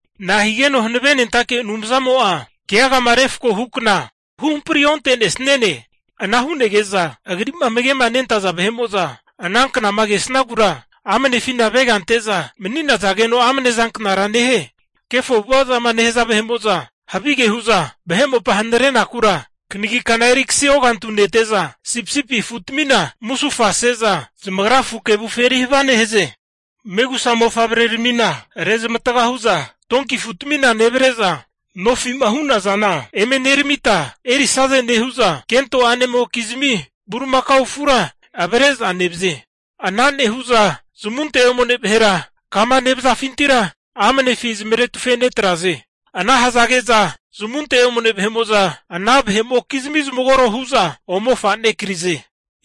Nahigeno Hanavenentake Anumzamo'a keagama refko hukna huhampri onte'nesniane? Ana hu'nege'za Agri'ma amage'manentaza vahe'mo'za ana knama kesagura amnefina avega ante'za mani'nazageno amne zanknara nehie? Kefo avu'ava'zama nehaza vahe'mo'za havige hu'za vahe mopa hanarenakura, kanagi kana eri kasi ogantu'a nente'za, sipisipi afutamina musufase'za zamagra afu kevufi eri havia nehaze. Megusa mofavreramina rezmatga hu'za donki afuzamia nevre'za, nofi'ma hu'nazana vahe'mo'za eme neramita erisaze nehu'za, kento a'nemokizmi bulimakao afura avre'za nevaze. Ana nehu'za zamunte omane vahera kama nevazafintira amanefi zamaretufe netraze. Ana hazage'za zamunte omne ana vahe'mokizmi zamagoro hu'za ome fra'nekize.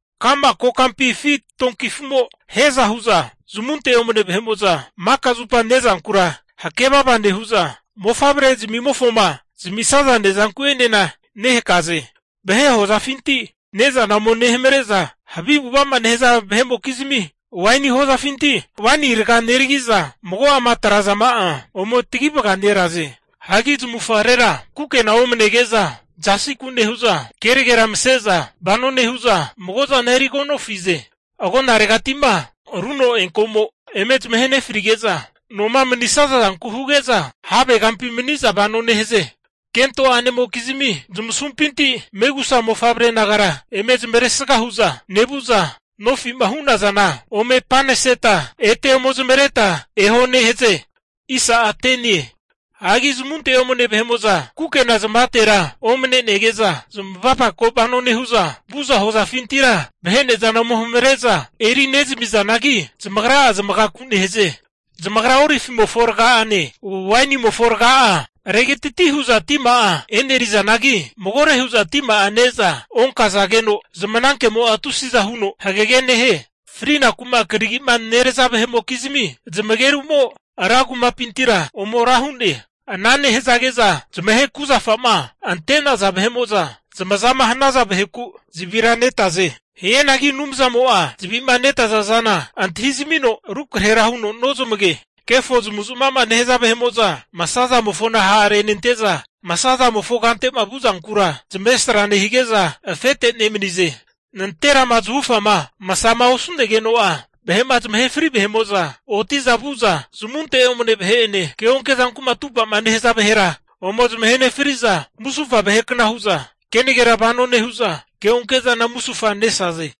Ka'ma kokampi afi donki afu'mo hiaza hu'za, zamunte omane vahe'mo'za makazupa ne'zankura hakevava nehu'za, mofavre'zamimofoma zamisaza ne'zanku'enena nehakaze. Vahe hozafinti ne'zana ome nehamre'za, havi avu'ava'ma nehaza vahe'mokizmi waini hozafinti waini raga neragi'za, mago'ama atre'nazama'a ome tagi vagare'naze. Hagi zamavufagarera kukena omnege'za zasiku nehu'za kenagera mase'za vano nehu'za, mago'zana erigonofize. Agonaregati'ma runo eanko'mo eme zamahe nefarige'za, noma manisaza zanku huge'za havegampi mani'za vano nehaze. Kento a'nemokizmi zamasumpinti megusa mofavre nagara, eme zamavaresga hu'za nevu'za, nofi'ma hu'nazana ome paneseta ete ome zamavareta eho nehaze. Hagi zamunte omne kukena zamavatera omnenege'za zamavapako vano nehu'za, vu'za hozafintira vahe ne'zana ome hamare'za eri nezamizanagi, zamagra'a zamagaku nehaze. Zamagra olivimofo raga'ane, wainimofo raga'a regatiti hu'za tima'a e'nerizanagi, magore hu'za tima'a ne'za onkazageno zmanankemo'a tusiza huno hagage nehie. Frinaku'ma karagi'ma neraza vahe'mokizmi zamageru'mo ran kumapintira ome ra hu'ne. Ana nehazage'za zamahe kuzafa'ma ante'naza vahe'mo'za zamazama hanaza vaheku zavira netaze. Hianagi Anumzamo'a zavi'ma netazazana antahizamino rukrahera huno nozamage. Kefo zamavu zamava'ma nehaza vahe'mo'za masazamofona ha'renente'za, masazamofo kante'ma vu'zankura zamavesra nehige'za afete nemanize. Nanterama zahufama masama osu'negeno'a, vahe'ma zamahe fri vahe'mo'za oti'za vu'za zamunte omne vahe'ene keonke zanku'ma atupa'ma nehaza vahera ome zamahe nefri'za, musufa vahekna hu'za kenagera vano nehu'za ke'onke'zana musufa nesaze.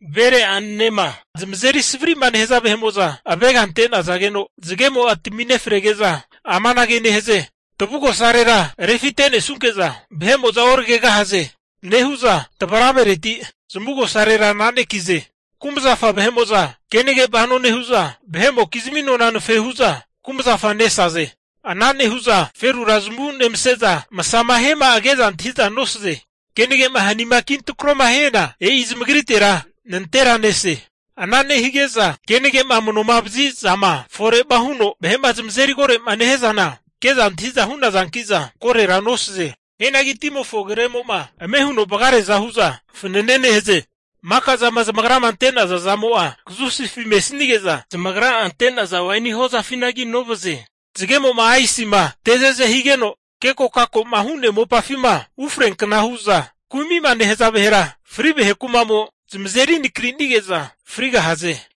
Vere a'nanema zamazeri savari'ma nehaza vahe'mo'za avega ante'nazageno, zagemo'a tami nefarege'za amanage nehaze. Tavugosarera refite'nesnunke'za vahe'mo'za oragegahaze nehu'za, tavaravereti zamavugosarera ana'nekize. Kumazafa vahe'mo'za kenage vano nehu'za, vahe'mokizmi nona anafe hu'za kumazafa nesaze. Ana nehu'za ferura zamavu nemase'za, masama hiama'a ke'za antahi'za nosaze. Kenage'ma hanima kintrakoma hiana e'i zamagritera nantera nese. Ana nehige'za kenage'ma amanovazi'zama fore'ma huno vahe'ma zamazeri koro'ma nehia zana ke'za antahi'za hu'nazanki'za korora nosaze. Hianagi timofo agremo'ma ame huno vagareaza hu'za fanane nehaze. Maka zama zamagrama ante'naza zamo'a kazusifi mesnige'za, zamagra'a ante'naza waini hozafinagi novaze. Zagemo'ma aisima te ze'zema higeno kekokako'ma hu'nea mopafima ufreankna hu'za kumi'ma nehaza vahera fri vahe kuma'mo zamazeri nakrinige'za frigahaze.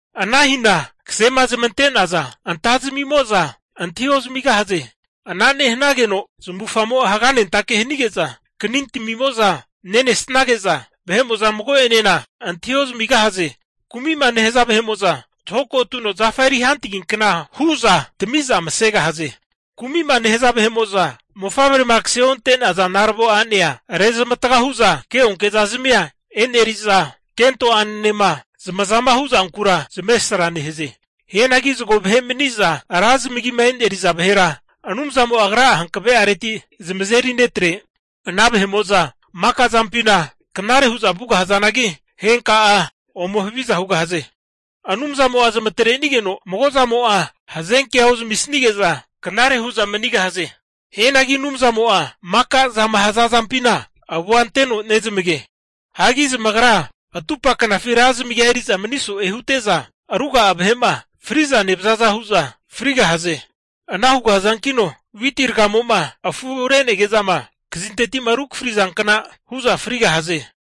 Ana hina kasema zamante'naza vahera anta'zmimo'za antahi ozamigahaze. Ana nehanageno zamavufagamo'a haganentake hanige'za kanintamimo'za nenesage'za, vahe'mo'za mago'enena antahi ozamigahaze. Kumi'ma nehaza vahe'mo'za zahoko tuno zafa eri hantagiankna hu'za tami'za masegahaze. Kumi'ma nehaza vahe'mo'za mofavrema kase onte'naza naravo a'nea rezmatga hu'za keonke'zazmia eneri'za, kento a'nenenema zamazama hu'zankura zamavesra nehaze. Hianagi zago vahe'ma mani'za vahe'mo'za ra zamagima e'neri'za vahera Anumzamo'a Agra'a hankave'areti zamazeri netre. Ana vahe'mo'za maka zampina knare hu'za vugahazanagi, henka'a ome haviza hugahaze. Anumzamo'a zamatrenigeno mago zamo'a hazenkea ozamisnige'za, knare hu'za manigahaze. Hianagi Anumzamo'a maka'zama hazazampina avua anteno nezamage. Hagi zamagra atupa knafi ra zamagia eri'za mani so'e hute'za, ruga'a vahe'ma fri'za nevazaza hu'za frigahaze. Ana hugahazankino witi ragamo'ma afu re'nege'zama kazinteti rukafari zankna hu'za frigahaze.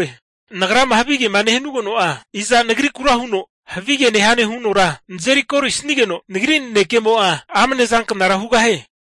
Nagrama havigema nehanugeno'a, iza nagrikura huno havige nehane hunora nazeri kori'sigeno, nagri nanekemo'a amne zanknara hugahie?